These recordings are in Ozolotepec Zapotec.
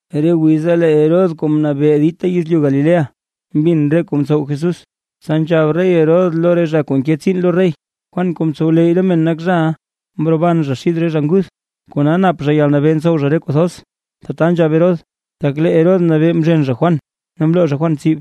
Re wiza lee Herodes kuu mnabee dita yezlyu Galilea, mbin re kuu mtsow Jesús. Tsa nzhab rey Herodes lo re zha kuu nke tsiin lo rey: ―Juan kuu mtsowleyy re men nak zhaʼa; mroban zha xid re zha nguth; kona nap zha yalnabee ntsow zha re kuu thoz. Tata nzhab Herodes, tak lee Herodes mnabee mzhen zha Juan ne mloo zha Juan tsib,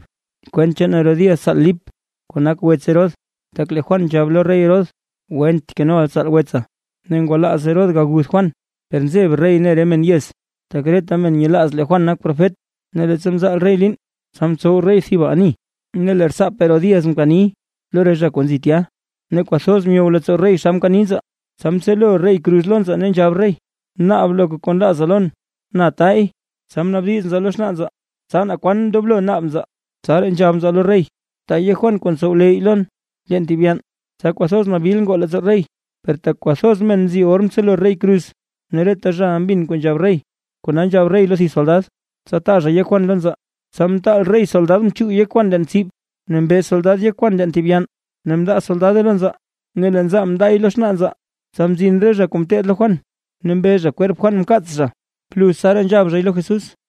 kwent chaan Herodías tsaal Lip kuu nak wets Herodes. Tak lee Juan nzhab lo rey Herodes: ―Went kenoʼa tsaal wetsa. Ne ngwalaaz Herodes aguth Juan, per nzeb rey ne re men yez, tak reta men nyelaaz lee Juan nak profet. Ne leettsa mzaal rey liin, tsa mtsow rey thib ani, ne lee rtsaap Herodías mkani lo re zha kuu nzi tya, ne kwathoz myow leettsoo rey xa mkani nzaa, tsa mtselo rey kruz lo nzaa ne nzhab rey: ―Naab loka kuu nlaaza lon, na taay. Tsa mnaabdiz nzaa lo xnaa nzaa, tsa naa kwan ndoblo naab nzaa, tsaraa nzhab nzaa lo rey: ―Taa yek Juan kuu ntsowleyy lon, leen thib yann. Tsa kwathoz nabil ngoo leettsoo rey; per tak kwathoz men nzi or mtselo rey kruz, ne reta zhaʼa mbin kuu nzhab rey, kona nzhab rey lo thib soldad, tsa taa zha yek Juan lo nzaa. Tsa mtaal rey soldad mchuug yek Juan leen tsib. Ne mbe soldad yek Juan leen thib yann, ne mndaa soldade lo nzaa, ne lee nzaa mndaay lo xnaa nzaa. Tsa mzin re zha kuu ngeteed lo Juan, ne mbe zha kwerp Juan mkaats zha. Bluz tsaraa nzhab zhay lo Jesús.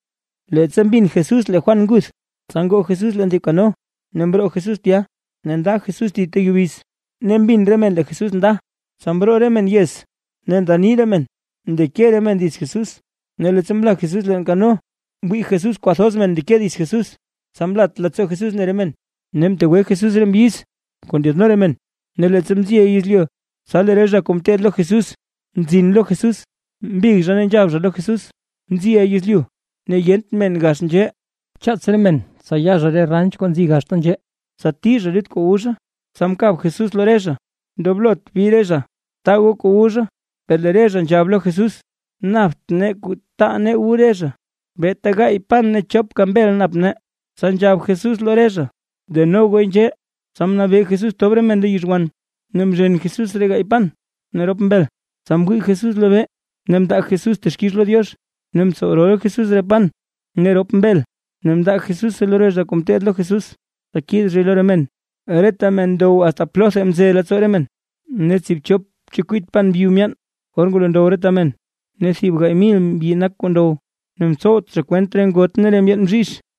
Leettsa mbin Jesús lee Juan nguth, tsa ngoo Jesús leen thib kano ne mroo Jesús tya, nda Jesús thib ta yubiz. Ne mbin re men lee Jesús nda, tsa mroo re men yez ne nda nii re men, mndeke re men dits Jesús. Ne leettsa mla Jesús leen kano, mwii Jesús kwathoz men ndeke dits Jesús. Tsa mlat leettsoo Jesús mne re men, ne mtegwe Jesús re mbyiz kuu ndyaadno re men. Ne leettsa mziʼa yezlyu, tsa lee re zha kuu ngeteed lo Jesús mzin lo Jesús, mbig zha ne nzhab zha lo Jesús: ―Mziʼa yezlyu, ne yent men gax nzhee. Bchaats re men tsa ya zha re ranch kuu nzi gaxta nzhee, tsa tii zha lut kuu wu zha. Tsa mkab Jesús lo re zha: ―Ndoblot bi re zha. Taa goo kuu wu zha. Per lee re zha nzhab lo Jesús: ―Napt nee kuu taa nee wu re zha, beeta gaay pan ne chopka mbel nap nee. Tsa nzhab Jesús lo re zha: ―Deno gooy nzhee. Tsa mnabee Jesús tob re men lo yizhwan. Ne mzhen Jesús re gaay pan ne rop mbel, tsa mwii Jesús lobee ne mndaa Jesús texkix lo Diox, ne mtsow rol Jesús re pan ne rop mbel ne mndaa Jesúse lo re zha kuu ngeteed lo Jesús, tsa kiid zhay lo re men. Reta men ndow asta plotha mze leettsoo re men. Ne tsiibchop chekwit pan byu myaan or ngwalo ndow reta men. Ne thib gaay mil mbyi nak kuu ndow, ne mtsowt zha kwent re ngot ne re ndyeen bzhizh.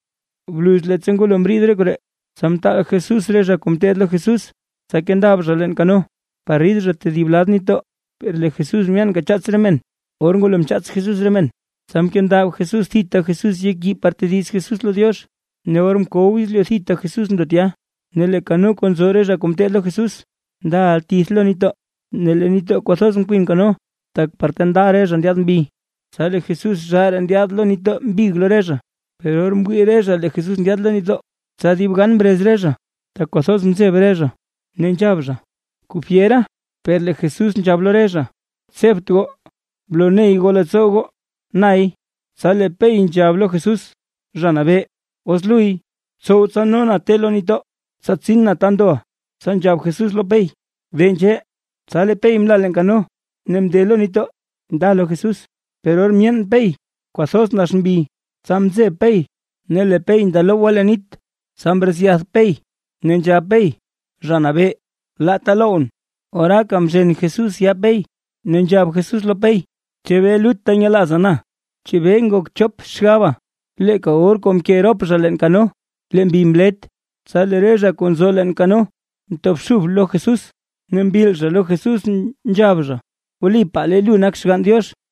Bluz leettsa ngwalo mriid koree, tsa mtaal Jesús re zha kuu ngeteed lo Jesús, tsa kendab zha leen kano, par rid zha tedib lad nitdoo. Per lee Jesús myaanka chaats re men. Or ngwalo mchaats Jesús re men, tsa mkendab thita Jesús yek yii par tediz Jesús lo Diox. Ne or mkow yezlyu thita Jesús ndo tya. Ne lee kano kuu nzo re zha kuu ngeteed lo Jesús ndaʼa tith lo nitdoo. Ne lee nitdoo kwathoz nkwin kano, tak par ta nda re zha ndyaad mbi. Tsa lee Jesús zhaaraa ndyaad lo nitdoo mbig lo re zha. Per or mwii re zha lee Jesús ndyaad lo nitdoo, tsa dib gan mrez re zha, tak kwathoz mzeb re zha, ne nzhab zha: ―¡Kuu fyera! Per lee Jesús nzhab lo re zha: ―Tsebt goo, bloney goo leettsoo goo nay. Tsa lee Pey nzhab lo Jesús: ―Zha Nabee, os luy, btsow tsa no na te lo nitdoo, tsa tsin na ta ndoʼa. Tsa nzhab Jesús lo Pey: ―De nzhee. Tsa lee Pey mla leen kano ne mnde lo nitdoo nda lo Jesús. Per or myeen Pey kwathoz nax mbi, tsa mzeb Pey, ne lee Pey ndalowgwa leen nit, tsa mretsyath Pey, ne nzhab Pey: ―Zha Nabee, laata lowʼn. Oraaka mzhen Jesús yaa Pey, ne nzhab Jesús lo Pey: ―¿Chebee lutta nyelaaza na? ¿Chebee ngok chop xgaba? Leeka or kuu mke rop zha leen kano, lee mbi mlet. Tsa lee re zha kuu nzo leen kano mtobxub lo Jesús, ne mbil zha lo Jesús nzhab zha: ―Wlipaa lee lu nak Xgann Diox.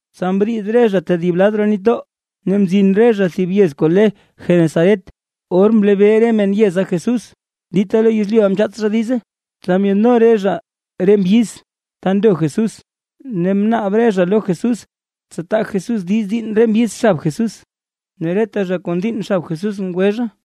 Tsa mriid re zha tedib lad roo nitdoo, ne mzin zha thib yez kuu le Genesaret. Or mlebee re men yeza Jesús, dita lo yezlyuʼa mchaats zha diize, tsa myaadno re zha re mbyiz ta ndo Jesús. Ne mnaab re zha lo Jesús tsa taa Jesús diiz diinn re mbyiz xab Jesús; ne reta zha kuu ndiinn xab Jesús ngwe zha.